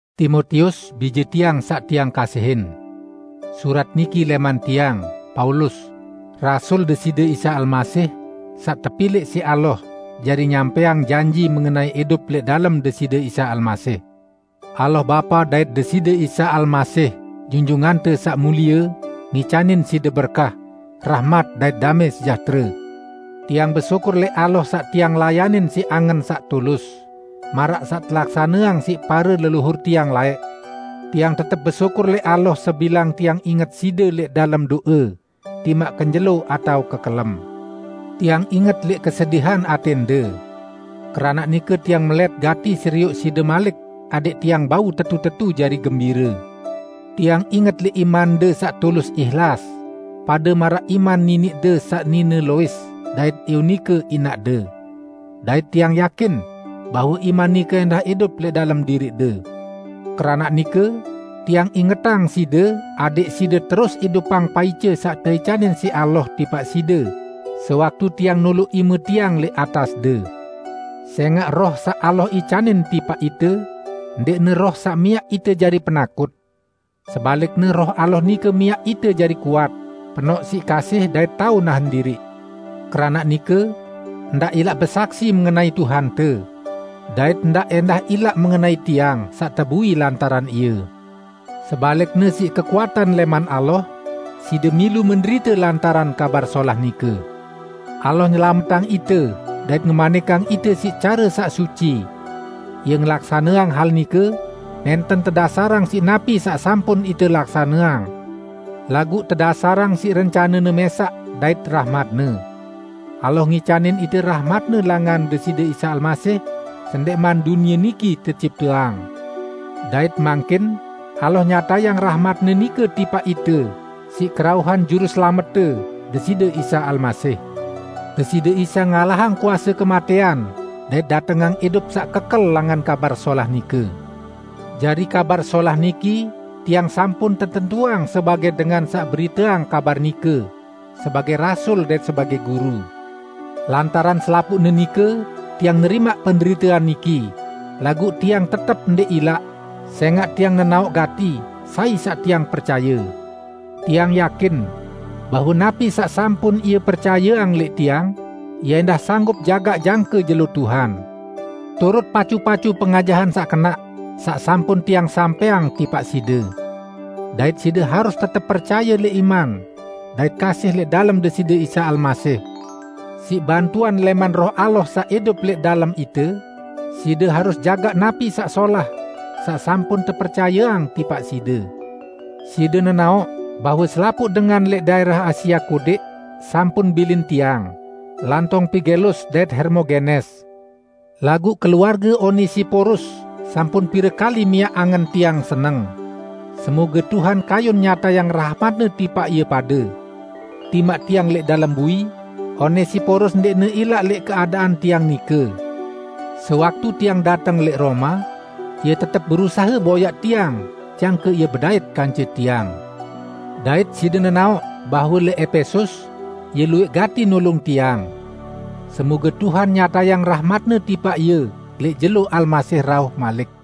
Timotius, bije tiang saq tiang kasihin! Surat niki lẽman tiang, Paulus, rasul Deside Isa Almasih saq tepilẽq siq Allah jari nyampẽang janji mengenai idup lẽq dalem Deside Isa Almasih. Allah Bapa dait Deside Isa Almasih Junjungante Saq Mulie ngicanin side berkah, rahmat dait damẽ sejahtere. Tiang besyukur lẽq Allah saq tiang layanin siq angen saq tulus, maraq saq telaksaneang siq pare leluhur tiang laẽq. Tiang tetep besyukur lẽq Allah sebilang tiang inget side lẽq dalem do'e, timaq kenjelo atao kekelem. Tiang inget lẽq kesedihan atẽnde. Keranaq nike tiang melẽt gati serioq side malik adẽq tiang bau tetu-tetu jari gembire. Tiang inget lẽq imande saq tulus ihlas, pade maraq iman niniqde saq nine Lois dait Eunike inaqde. Dait tiang yakin bahwe iman nike ẽndah idup lẽq dalem diriqde. Keranaq nike, tiang ingetang side adẽq side terus idupang paice saq teicanin siq Allah tipaq side sewaktu tiang noloq ime tiang lẽq atasde. Sẽngaq Roh saq Allah icanin tipaq ite, ndẽqne Roh saq miaq ite jari penakut. Sebalikne Roh Allah nike miaq ite jari kuat, penoq siq kasih dait tao nahen diriq. Keranaq nike, ndaq ilaq besaksi mengenai Tuhante, dait ndaq ẽndah ilaq mengenai tiang, saq tebui lantaran Ie. Sebalikne siq kekuatan lẽman Allah, side milu menderite lantaran Kabar Solah nike. Allah nyelametang ite dait ngemanikang ite siq care saq suci. Ie ngelaksaneang hal nike nẽnten tedasarang siq napi saq sampun ite laksaneang, laguq tedasarang siq rencane-Ne mẽsaq dait rahmat-Ne. Allah ngicanin ite rahmat-Ne langan Deside Isa Almasih sendẽqman dunie niki tecipteang. Dait mangkin, Allah nyatayang rahmat-Ne nike tipaq ite siq kerauhan Juruselamette, Deside Isa Almasih. Deside Isa ngalahang kuase kematẽan dait datengang idup saq kekel langan Kabar Solah nike. Jari Kabar Solah niki tiang sampun tetentuang sebagẽ dengan saq beriteang kabar nike, sebagẽ rasul dait sebagẽ guru. Lantaran selapuqne nike tiang nerimaq penderitean niki, laguq tiang tetep ndẽq ilaq, sẽngaq tiang nenaoq gati sai saq tiang percaye. Tiang yakin bahwe napi saq sampun Ie percayeang lẽq tiang, Ie ẽndah sanggup jagaq jangke Jelo Tuhan. Turut pacu-pacu pengajahan saq kenaq saq sampun tiang sampẽang tipaq side. Dait side harus tetep percaye lẽq iman dait kasih lẽq dalem Deside Isa Almasih. Siq bantuan lẽman Roh Allah saq idup lẽq dalem ite, side harus jagaq napi saq solah saq sampun tepercayeang tipaq side. Side nenaoq bahwe selapuq dengan lẽq daẽrah Asia Kodẽq sampun bilin tiang, lantong Pigelus dait Hermogenes. Laguq keluarge Onesiporus sampun pire kali miaq angen tiang seneng. Semoge Tuhan kayun nyatayang rahmat-Ne tipaq ie pade. Timaq tiang lẽq dalem bui, Onesiporus ndẽqne ilaq lẽq keadaan tiang nike. Sewaktu tiang dateng lẽq Roma, ie tetep berusahe boyaq tiang jangke ie bedait kance tiang. Dait side nenaoq bahwe lẽq Epesus, ie luwẽq gati nulung tiang. Semoge Tuhan nyatayang rahmat-Ne tipaq ie lẽq jelo Almasih rauh malik.